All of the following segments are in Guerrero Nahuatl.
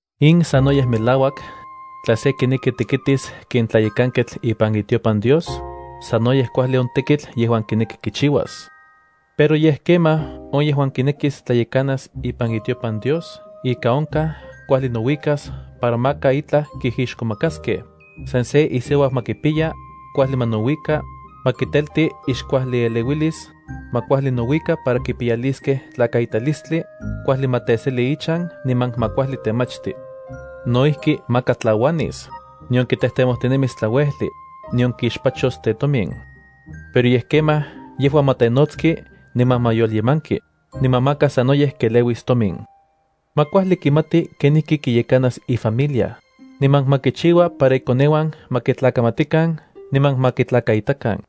In sanoyej melauak, tla se kineki tekitis ken tlayekanketl ipan itiopan Dios, sanoyej kuajli on tekitl yejuan kineki kichiuas. Pero yej kemaj on yejuan kinekis tlayekanas ipan itiopan Dios ika onkaj kuajli nouikas para maka itlaj kijixkomakaskej, san se isiuau ma kipiya, kuajli ma nouika, ma kitelti ixkuajlieleuilis, ma kuajli nouika para kipiyaliskej tlakaitalistli, kuajli ma teseli ichan niman ma kuajli temachti. No ijki maka tlauanis, nion kitejtemojtinemis tlauejli, nion kixpachos tetomin. Pero yej kemaj yejua ma tenotski niman ma yolyemanki, niman maka sanoyej keleuis tomin. Ma kuajli kimati kenijki kiyekanas ifamilia, niman ma kichiua para ikoneuan ma kitlakamatikan niman ma kitlakaitakan.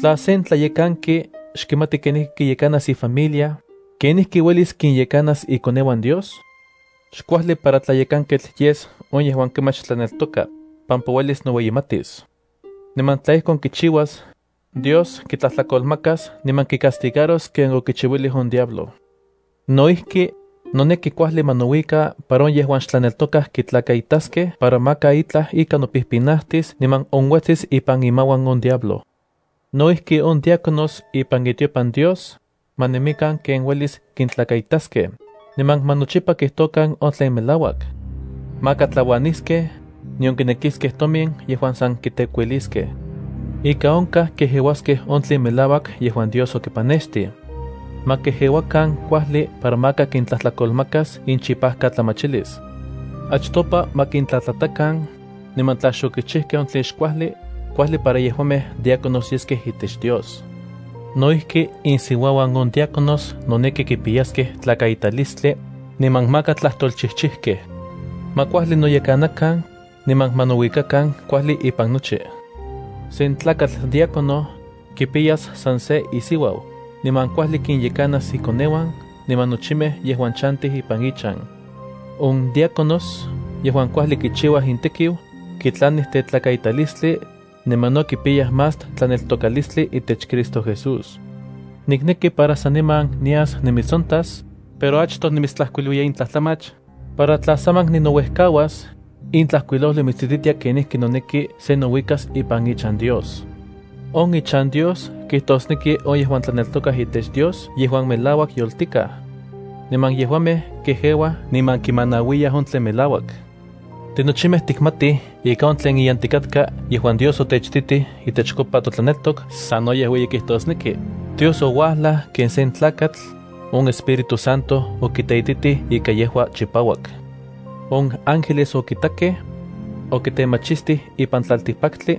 (Tla sen tlayekanki xkimati kenijki kiyekanas ifamilia, ¿kenijki uelis kinyekanas ikoneuan Dios?) Xkuajli para tlayekanketl yes on yejuan kemach tlaneltoka, pampa uelis noueyimatis. Niman, tla ijkon kichiuas, Dios kitlajtlakolmakas niman kicastigaros ken okichiuilij on diablo. No ijki, noneki kuajli ma nouika para on yejuan xtlaneltokaj kitlakaitaskej para maka itlaj ika nopijpinajtis niman onuetsis ipan imauan on diablo. No ijki on diáconos ipan itiopan Dios, ma nemikan ken uelis kintlakaitaskej, niman ma nochipa kijtokan on tlen melauak. Maka tlauaniskej, nion kinekiskej tomin yejuan san kitekuiliskej. Ika onkaj kejeuaskej on tlen melauak yejuan Dios okipanextij. Ma kejeuakan kuajli para maka kintlajtlakolmakas inchipajkatlamachilis. Achtopa ma kintlatlatakan, niman tla xokichijkej on tlen xkuajli, kuajli para yejuamej diáconos yeskej itech Dios. No ijki insiuauan on diáconios noneki kipiyaskej tlakaitalistli, niman maka tlajtolchijchijkej. Ma kuajli noyekanakan, niman ma nouikakan kuajli ipan nochi. Sen tlakatl diácono, kipiyas san se isiuau, niman kuajli kinyekanas ikoneuan niman nochimej yejuan chantij ipan ichan. On diáconos yejuan kuajli kichiuaj intekiu, kitlanij tetlakaitalistli, niman no kipiyaj más tlaneltokalistli itech Cristo Jesús. Nikneki para saniman nias nimitsontas, pero achtoj nimitstlajkuilouiya in tlajtlamach, para tla saman ninouejkauas, in tlajkuilojli mitsititia kenijki noneki se nouikas ipan ichan Dios. On ichan Dios kijtosneki on yejuan tlaneltokaj itech Dios yejuan melauak yoltikaj. Niman yejuamej kejeuaj niman kimanauiyaj on tlen melauak. Tinochimej tikmatij ika on tlen iyantikatka yejuan Dios otechititij itechkopa totlaneltok sanoyej ueyi kijtosneki: Dios ouajlaj ken sen tlakatl; on Espíritu Santo okiteititij ika yejua chipauak. On ángeles okitakej. Okitemachistijkej ipan tlaltikpaktli.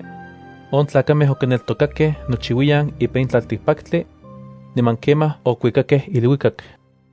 On tlakamej okineltokakej nochiuiyan ipan in tlaltikpaktli. Niman kemaj okuikakej iluikak.